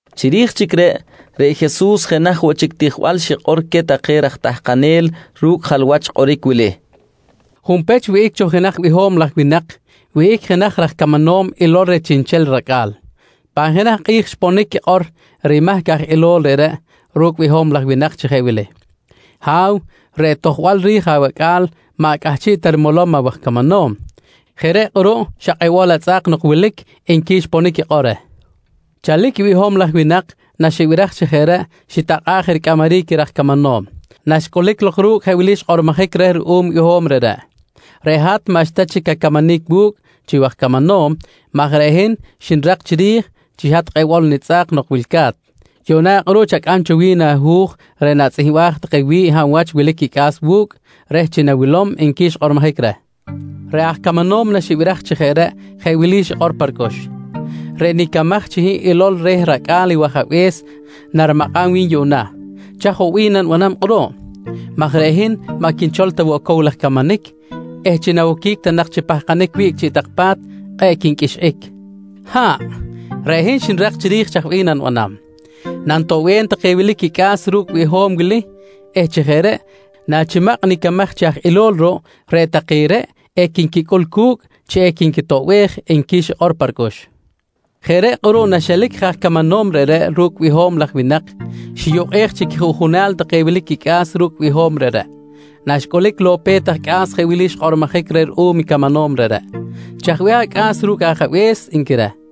Chiri̱j chic reꞌ, reꞌ Jesus jenaj woꞌ chic tijbal xikꞌor queh take raj tahkanel ru̱cꞌ jalwach kꞌoric wili: «Junpech, wihꞌic cho jenaj biho̱m laj winak wihꞌic jenaj raj camanom ilol reh chiꞌnchel racꞌa̱l. Pan jenaj kꞌi̱j xponic quikꞌor rimahc aj ilol reꞌreꞌ ru̱cꞌ i biho̱m laj winak chi jeꞌ wili: ‹Ha̱w, reꞌ tojbal ri̱j awacꞌa̱l maꞌ cꞌahchiꞌ ta rimolom awaj camanom. Jeꞌ reꞌ kꞌuruꞌ xa kꞌebol atzꞌa̱k nok wilic, nqui xponic quikꞌor reh. «Chalic i biho̱m laj winak naxibiraj chi jeꞌ reꞌ xitakꞌa̱ꞌ je ricꞌamaric i raj camanom. Naxcꞌulic lok ru̱cꞌ jeꞌ wili xkꞌormojic reh ruꞌum i biho̱m reꞌreꞌ: ‹Reꞌ hat maꞌxta chic acamanic wu̱cꞌ chi waj camanom maj reꞌ hin xnirak chiri̱j chi xa hat kꞌebol nitzꞌa̱k nok wilca̱t. Yuꞌna kꞌuruꞌ chacꞌam cho wi̱n ahu̱j reꞌ natzꞌihmbaj take wi̱ꞌ hab wach wilic quicꞌa̱s wu̱cꞌ reh chi nawilom, nqui xkꞌormojic reh. «Reꞌ aj camanom naxibiraj chi jeꞌ reꞌ jeꞌ wili xikꞌor pa ricꞌux: ‹Reꞌ nicamaj chi hin ilol reh racꞌa̱l i wajabe̱s narimakꞌam wi̱n yuꞌna. Chaj woꞌ bih nanibanam kꞌuruꞌ? maj reꞌ hin maꞌ quinchol ta cow laj camanic eh chi nawoquic ta nak chi pahkanic wiꞌc chiꞌ tak pa̱t kꞌe̱ꞌ quinqꞌuixꞌic. Ha̱ꞌ, reꞌ hin xnirak chic chiri̱j chaj bih nanibanam: Nanitoꞌbem take wilic quicꞌa̱s ru̱cꞌ biho̱m wili eh chi jeꞌ reꞌ nachimakꞌ nicamaj chi aj ilol ruꞌ, reꞌ take reꞌ equinquicꞌul cu̱cꞌ chi equinquitoꞌbej, nqui xikꞌor pa ricꞌux. «Jeꞌ reꞌ kꞌuruꞌ naxelic je aj camanom reꞌreꞌ ru̱cꞌ biho̱m laj winak, xiyukꞌej chi quijuꞌjunal take wilic quicꞌa̱s ru̱cꞌ biho̱m reꞌreꞌ. Naxcꞌulic lok i pe̱t aj cꞌa̱s jeꞌ wili xkꞌormojic reh ruꞌum camanom reꞌreꞌ: ‹Chaj bih acꞌa̱s ru̱cꞌ ajabe̱s? nqui reh.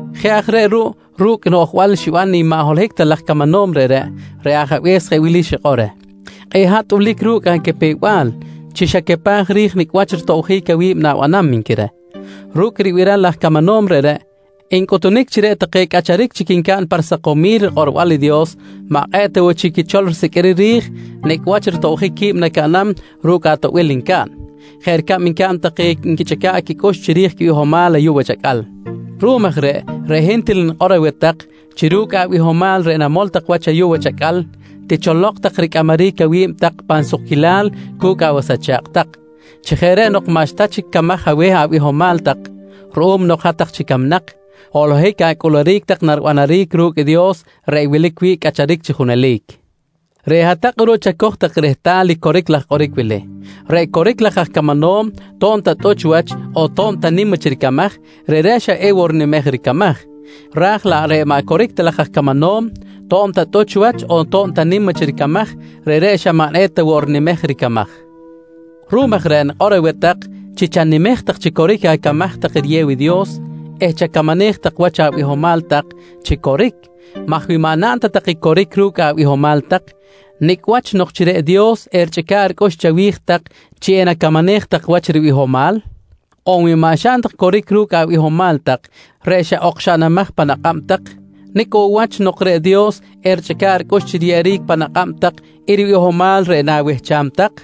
«Jeꞌ aj reꞌ ruꞌ ru̱cꞌ noꞌjbal xiban i maꞌ holohic ta laj aj camanom reꞌreꞌ, reꞌ ajabe̱s jeꞌ wili xikꞌor reh: ‹Kꞌe̱ꞌ hat tꞌulic ru̱cꞌ acapew-bal chi xacapaj ri̱j nicꞌ wach ritobjic awi̱b na̱banam, nqui reh. «Ru̱cꞌ ribiral i aj camanom reꞌreꞌ ncꞌuhtunic chi reꞌ take cꞌacharic chic ncaꞌn pa risakomil rikꞌorbal i Dios maꞌ kꞌe̱ꞌ ta woꞌ chic quichol risiqꞌuiric ri̱j nicꞌ wach ritobjic qui̱b nacaꞌnam ru̱cꞌ atoꞌbil ncaꞌn, jeꞌ ricab ncaꞌn take nquichꞌica̱ꞌ quicꞌux chiri̱j quibihomal ayuꞌ wach acꞌal. Ruꞌum aj reꞌ, reꞌ hin til nikꞌor aweh tak chi ru̱cꞌ abihomal reꞌ namol tak wach ayuꞌ wach acꞌal ticholok tak ricꞌamaric awi̱b tak pan sukquilal cu̱cꞌ awas acha̱kꞌ tak. Chi jeꞌ reꞌ nok maꞌxta chic camaj aweh abihomal tak ruꞌum nok hat-tak chic camnak, holohic acꞌuluric tak naribanaric ru̱cꞌ i Dios reꞌ wilic wi̱ꞌ cꞌacharic chi junelic. «Reꞌ hat-tak kꞌuruꞌ chacoj tak rehtal i coric laj kꞌoric wili: Reꞌ coric laj aj camanom to̱b ta tꞌuch wach on to̱b ta nim wach ricamaj, reꞌreꞌ xa ewoꞌ rinimej ricamaj. Raj laꞌ reꞌ maꞌ coric ta laj aj camanom to̱b ta tꞌuch wach on to̱b ta nim wach ricamaj, reꞌreꞌ xa maꞌ eta woꞌ rinimej ricamaj. Ruꞌum aj reꞌ nikꞌor aweh tak chi chanimej tak chi coric acamaj tak riyew i Dios eh chacamanej tak wach abihomal tak chi coric maj wi maꞌ naꞌn ta tak i coric ru̱cꞌ abihomal tak, nicꞌ wach nok chi reꞌ Dios erichꞌica̱ꞌ ricꞌux chawi̱j tak chi enacamanej tak wach ribihomal? On wi maꞌ xaꞌn tak i coric ru̱cꞌ abihomal tak reꞌ xa okxaꞌnamaj pan akꞌab tak, nicꞌ woꞌ wach nok reꞌ Dios erichꞌica̱ꞌ ricꞌux chi riyeꞌeric pan akꞌab tak i ribihomal reꞌ na̱wehcham tak?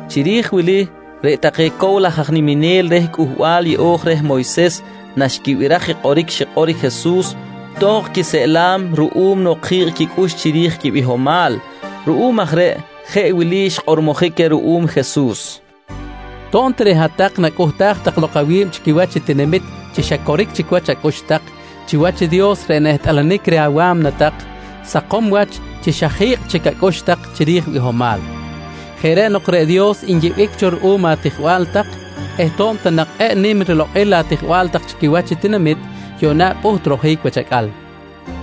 Chiri̱j wili reꞌ take cow laj aj niminel reh Cꞌuhbal Yeꞌo̱j reh Moyses naxquibiraj i kꞌoric xikꞌor i Jesus, tohkꞌ quiseꞌlam ruꞌum nok ji̱kꞌ quicꞌux chiri̱j quibihomal. Ruꞌum aj reꞌ jeꞌ wili xkꞌormojic queh ruꞌum Jesus: «To̱b ta reꞌ hat-tak nacꞌuhtaj tak lok awi̱b chi quiwach i tinamit chi xa coric chic wach acꞌux tak, chiwach i Dios reꞌ nehtꞌalanic reh awa̱mna tak sakom wach chi xa ji̱kꞌ chic acꞌux tak chiri̱j bihomal. Jeꞌ reꞌ nok reꞌ Dios nyiꞌbic cho ruꞌum atijbal tak eh to̱b ta nak kꞌe̱ꞌ nim rilokꞌil atijbal tak chi quiwach i tinamit, yuꞌna pꞌuht rojic wach acꞌal.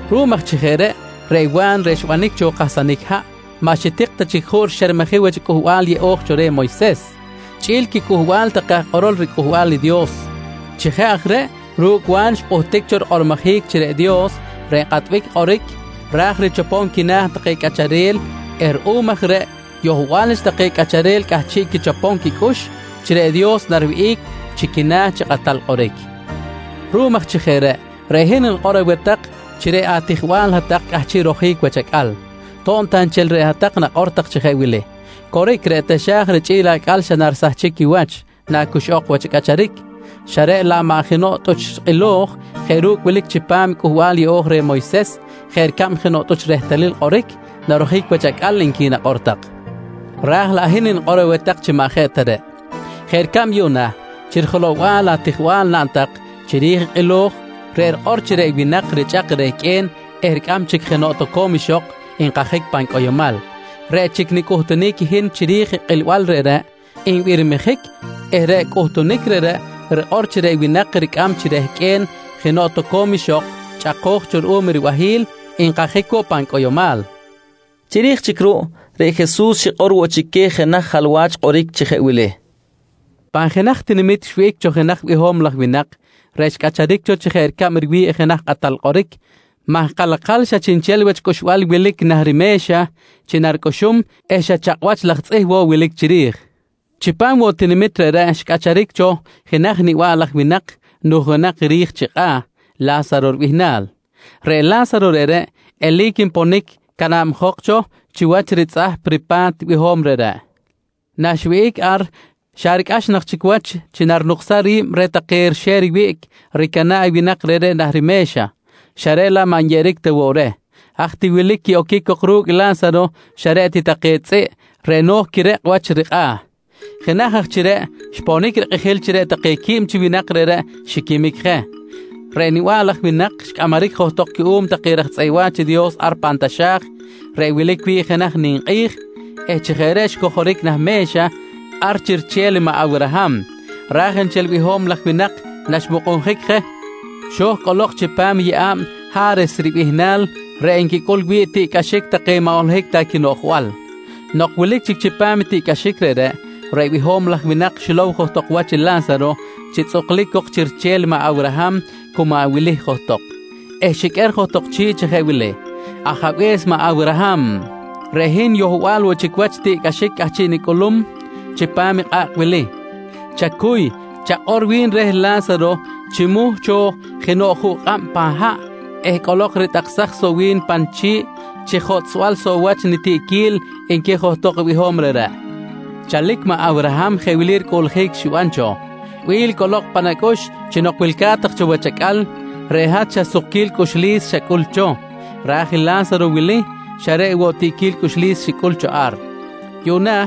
Ruꞌum aj chi jeꞌ reꞌ, reꞌ Wa̱n reꞌ xbanic cho kahsanic haꞌ maꞌ xitik ta chic juꞌ rixermejic wach i Cꞌuhbal Yeꞌo̱j reh Moyses, chꞌi̱l i quicꞌuhbal take aj kꞌorol riCꞌuhbal i Dios. Chi jeꞌ aj reꞌ ru̱cꞌ Wa̱n xpꞌuhtic cho rikꞌormojic chi reꞌ Dios reꞌ nkꞌatbic kꞌoric ra̱j richopom quina̱ take cꞌacharel eh ruꞌum aj reꞌ yohbal wach take cꞌacharel cꞌahchiꞌ quichopom quicꞌux chi reꞌ Dios nariwihꞌic chi quina̱ chi kꞌatal kꞌoric. Ruꞌum aj chi jeꞌ reꞌ, reꞌ hin nikꞌor aweh tak chi reꞌ atijbal hat-tak cꞌahchiꞌ rojic wach acꞌal to̱b ta nchel reꞌ hat-tak nakꞌor chi jeꞌ wili: ‹Coric, reꞌ taxa̱j richꞌi̱l acꞌal narisahchic wach nacuxꞌok wach i cꞌacharic, xa reꞌ laꞌ maꞌ jenoꞌ tꞌuch kꞌilo̱j jeꞌ ru̱cꞌ wilic chipam Cꞌuhbal Yeꞌo̱j reh Moyses jeꞌ ricab jenoꞌ tꞌuch rehtalil kꞌoric, narojic wach acꞌal, nqui nakꞌor tak. «Raj laꞌ hin nikꞌor aweh tak chi maꞌ jeꞌ ta reꞌ. Jeꞌ ricab yuꞌna chi rijelow-bal atijbal naꞌn tak chiri̱j i kꞌilo̱j reꞌ rikꞌor chi reꞌ winak richꞌak rehqꞌue̱n eh ricꞌam chic jenoꞌ toco̱m ixok nkajic pan cꞌoyomal, reꞌ chic nicꞌuhtunic i hin chiri̱j i kꞌilbal reꞌreꞌ nbirmijic eh reꞌ cꞌuhtunic reꞌreꞌ rikꞌor chi reꞌ winak ricꞌam chi rehqꞌue̱n jenoꞌ toco̱m ixok chꞌako̱j cho ruꞌum ribahi̱l, nkajic woꞌ pan cꞌoyomal, nqui Jesus queh. Chiri̱j chic ruꞌ, reꞌ Jesus xikꞌor woꞌ chic queh jenaj jalwach kꞌoric chi jeꞌ wili: «Pan jenaj tinamit xwihꞌic cho jenaj biho̱m laj winak reꞌ xcꞌacharic cho chi jeꞌ ricab riwi̱ꞌ jenaj kꞌatal kꞌoric maj kalakal xa chiꞌnchel wach cꞌuxbal wilic nah rime̱xa chi naricꞌuxum eh xa chakꞌ wach laj tzꞌih woꞌ wilic chiri̱j. Chipam woꞌ tinamit reꞌreꞌ xcꞌacharic cho jenaj niba̱ꞌ laj winak nujunak ri̱j chi kꞌa̱ La̱saro ribihnal. Reꞌ La̱saro reꞌreꞌ eli̱c nponic canabjok cho chiwach ritzꞌahp ripa̱t i biho̱m reꞌreꞌ. Nanwihꞌic ar xa ricꞌax nak chic wach chi narinuksam ri̱b reh take rixe̱r wiꞌc ricana̱ꞌ i winak reꞌreꞌ nah rime̱xa, xa reꞌ laꞌ maꞌ nyeꞌeric ta woꞌ reh. Haj ti wilic i quiꞌoquic cok ru̱cꞌ La̱saro xa reꞌ ti take tzꞌiꞌ reꞌ no̱j quirekꞌ wach i rikꞌa̱. «Jenaj aj chi reꞌ, xponic rikꞌijil chi reꞌ take quib chi winak reꞌreꞌ xiquimic je. Reꞌ niba̱ꞌ laj winak xcꞌamaric johtok cuꞌum take raj tzꞌeꞌ wa̱ch i Dios ar pan taxa̱j reꞌ wilic wi̱ꞌ jenaj ninkꞌi̱j eh chi jeꞌ reꞌ xcojoric nah me̱xa ar chi riche̱l i maꞌ Awraham. Ra̱j nchel i biho̱m laj winak, naxmukꞌunjic je xo̱j cꞌolok chipam i yeꞌa̱b Ha̱res ribihnal reꞌ nquicꞌul wi̱ꞌ tiꞌcꞌaxic take maꞌ holohic ta quinoꞌjbal. Nok wilic chic chipam i tiꞌcꞌaxic reꞌreꞌ, reꞌ biho̱m laj winak xilow johtok wach i La̱saro chi tzꞌuklic cok chi riche̱l maꞌ Awraham cu maꞌ wili johtok eh xiqꞌuer johtok chi̱ꞌ chi jeꞌ wili: ‹Ajabe̱s maꞌ Awraham, reꞌ hin yohbal woꞌ chic wach tiꞌquil cꞌahchiꞌ nicꞌulum chipam i kꞌa̱kꞌ wili. Chacuy, chakꞌor wi̱n reh La̱saro chimuh cho jenoꞌ juꞌ kꞌab pan haꞌ eh cꞌolok ritꞌaksaj soꞌ wi̱n pa nichi̱ꞌ chi jotꞌsbal soꞌ wach nitiꞌquil, nqui johtok i biho̱m reꞌreꞌ. «Chalic maꞌ Awraham jeꞌ wili ricꞌuꞌljic xiban cho: ‹Bi̱l, cꞌolok pan acꞌux chi nok wilca̱t tak cho wach acꞌal, reꞌ hat xa sukquil cꞌuxlis xacꞌul cho, raj i La̱saro wili xa reꞌ woꞌ tiꞌquil cꞌuxlis xicꞌul cho ar. Yuꞌna,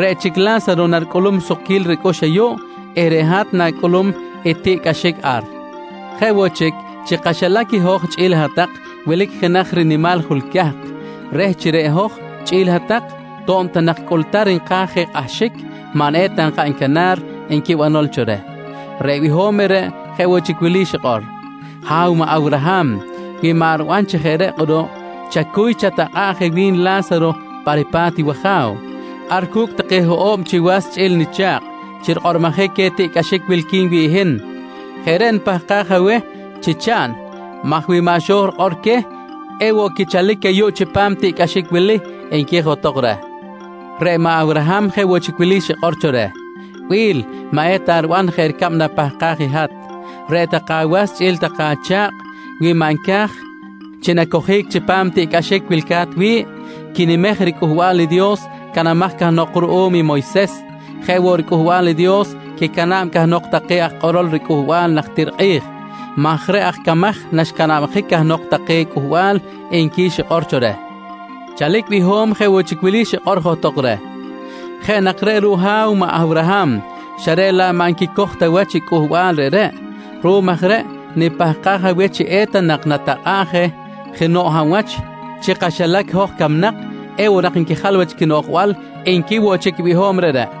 reꞌ chic i La̱saro naricꞌulum sukquil ricꞌux ayuꞌ eh reꞌ hat na̱cꞌulum i tiꞌcꞌaxic ar. Jeꞌ woꞌ chic, chi kaxilac i hoj chꞌi̱l i hat-tak wilic jenaj rinimal jul cahk reh chi reꞌ hoj chꞌi̱l hat-tak, to̱b ta nak cꞌultar nka̱j je kꞌahxic, maꞌ eta nkaꞌn canar, nqui banol cho reh. «Reꞌ biho̱m reꞌreꞌ jeꞌ woꞌ chic wili xikꞌor: ‹Ha̱w maꞌ Awraham wi maꞌ riban chi jeꞌ reꞌ kꞌuruꞌ, chacuy chatakꞌa̱ꞌ je wi̱n i La̱saro pa ripa̱t i waja̱w, ar cu̱cꞌ take hoꞌo̱b chi was chꞌi̱l nicha̱kꞌ chi rikꞌororic queh i tiꞌcꞌaxic wilqui̱n wi̱ꞌ hin. Jeꞌ reꞌ nipahkaj aweh chi chaꞌn maj wi maꞌ xo̱j rikꞌor queh, ewoꞌ quichalic ayuꞌ chipam tiꞌcꞌaxic wili, nqui johtok reh. «Reꞌ maꞌ Awraham jeꞌ woꞌ chic wili xikꞌor cho reh: ‹Bi̱l, maꞌ eta riban jeꞌ ricab napahkaj i hat. Reꞌ take awas chꞌi̱l take acha̱kꞌ wi maꞌ nca̱j chi nacojic chipam i tiꞌcꞌaxic wilca̱t wi̱ꞌ, quinimej i riCꞌuhbal i Dios canamaj cahnok ruꞌum i Moyses jeꞌ woꞌ i riCꞌuhbal i Dios quicana̱b cahnok take aj kꞌorol riCꞌuhbal najtir kꞌi̱j maj reꞌ aj camaj naxcanabjic cahnok take cꞌuhbal, nqui xikꞌor cho reh. «Chalic i biho̱m jeꞌ woꞌ chic wili xikꞌor johtok reh: ‹Jeꞌ nak reꞌ ruꞌ Ha̱w maꞌ Awraham, xa reꞌ laꞌ maꞌ nquicoj ta wach i cꞌuhbal reꞌreꞌ. Ruꞌum aj reꞌ nipahkaj aweh chi eta nak natakꞌa̱ꞌ je jenoꞌ hab wach chi kaxilac i hoj camnak, ewoꞌ nak nquijal wach quinoꞌjbal, nqui woꞌ chic i biho̱m reꞌreꞌ.